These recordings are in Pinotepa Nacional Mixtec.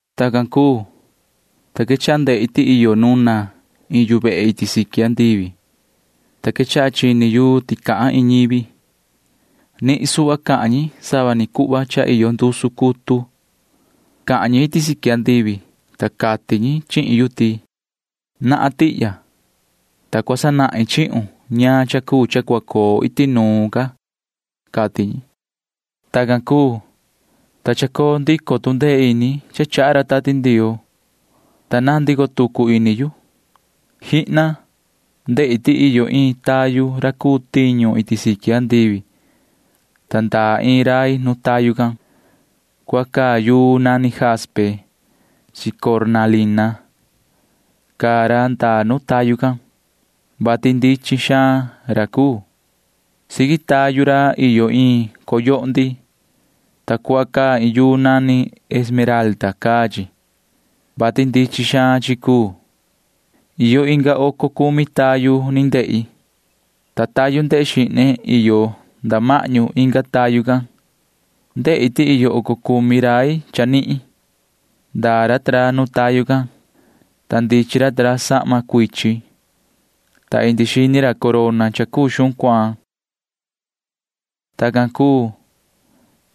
Tacan cuu, ta quechaha ndehi ti iyo nuna iin yu vehe iti siqui andivi, ta quechaha chini yu ti cahan iin ñivi. Nihin suhva cahan ñi sava ni cuhva cha iyo ndusu cutu. Cahan ñi iti siqui andivi, ta cati ñi chihin yu ti: ―Nahan tihya, ta cua sanahin chihun ñaan cha cuu cha cua coo iti nuun ca ―cati ñi. Tacan cuu, ta chacoo ndico tu ndee ini cha chaha ra Tati Ndioo, ta naan ndico tucu ini yu. ¡Jihna! Ndehi ti iyo iin tayu ra cuu tiñu iti siqui andivi, ta ndaa iin rai nu tayu can. Cuhva caa yuu nani jaspe chi cornalina caa ra ndaa nu tayu can, vati ndichin xaan ra cuu. Siqui tayu ra iyo iin coyohndi, ta cuhva caa iin yuu nani esmeralda caa chi, vati ndichin xaan chi cuu. Iyo inga oco cumi tayu ni ndehi, ta tayu ndehe xihne iyo nda mahñu inga tayu can. Ndehi ti iyo oco cumi rai chanihin. Ndaa ra ta ra nu tayu can, ta ndichin ra ta ra sahma cuichin, ta indi xini ra corona cha cuu xuhun cuaan. Tacan cuu,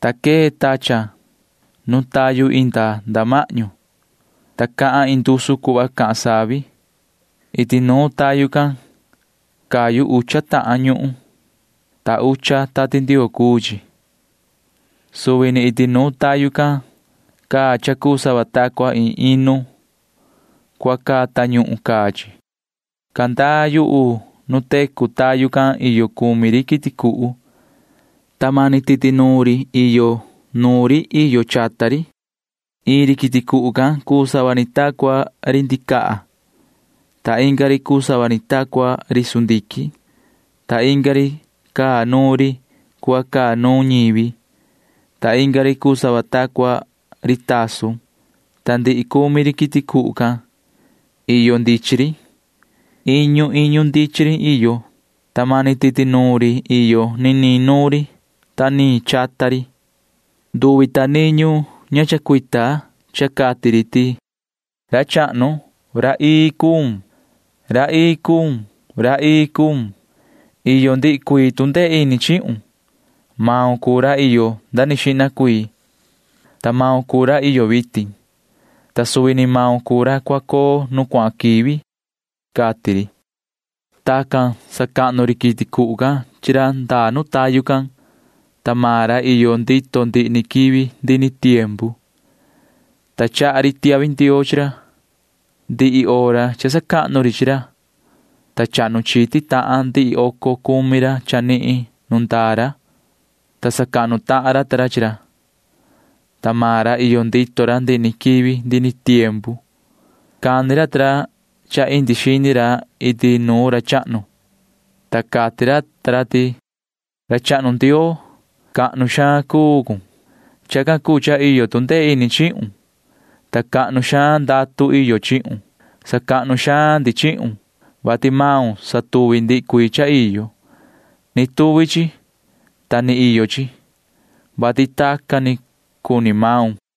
ta quee tachan nu tayu inda nda mahñu, ta cahan iin ndusu cuhva cahan savi. Iti nuun tayu can cayu ucha tahan ñuhun, ta ucha Tati Ndioo cuu chi. Suvi ni iti nuun tayu can caa cha cuu sava ta cua iin inu. Cuhva caa tañuhun caa chi. Candaa yuhu nu tecu tayu can iyo cumi ri quiti cuhu, ta mani titi nuun ri iyo nuun ri iyo chata ri. Iin ri quiti cuhu can cuu sava ni ta cua ri ndicaha, ta inga ri cuu sava ni ta cua ri sundiquin, ta inga ri caa nuun ri cuhva caa nuun ñivi, ta inga ri cuu sava ta cua ri tasun. Ta ndihi cumi ri quiti cuhu can―iyo ndichin ri. Iñu iñu ndichin ri iyo, ta mani titi nuun ri iyo niniin nuun ri niniin chata ri. Nduvi ta niñu ña chacuita cha cati ri ti: Yoho ra chahnu, ra ii cun. Ra ii cun. Ra ii cun. Iyo ndihi cuii tu ndee ini chihun. Maun cuu ra iyo nda ni xihna cuii, ta maun cuu ra iyo vitin, ta suvi ni maun cuu ra cua coo nu cuahan quivi, cati ri. Tacan sacahnu ri quiti cuhu can chi ra ndaa nu tayu can, ta maan ra iyo ndito ndihi ni quivi ndihi ni tiempu, ta chaha ri tiahvi ndioo chi ra. Ndihi hora cha sacahnu ri chi ra, ta chahnu chiti tahan ndihi oco cumi ra chanihin nu ndaa ra, ta sacahnu tahan ra ta ra chi ra, [ta maan ra iyo ndito ra ndihi ni quivi ndihi ni tiempu]. Cani ra ta ra cha indi xini ra iti nuun ra chahnu, ta cati ra ta ra ti: Yoho ra chahnu Ndioo, cahnu xaan cuu cun. Chacan cuu cha iyo tu ndee ini chihun, ta cahnu xaan ndatu iyo chihun. Sacahnu xaan ndi chihun, vati maun satuvi ndihi cuii cha iyo. Ni tuvi chi, ta ni iyo chi, vati tacan ni cuni maun, cati ra.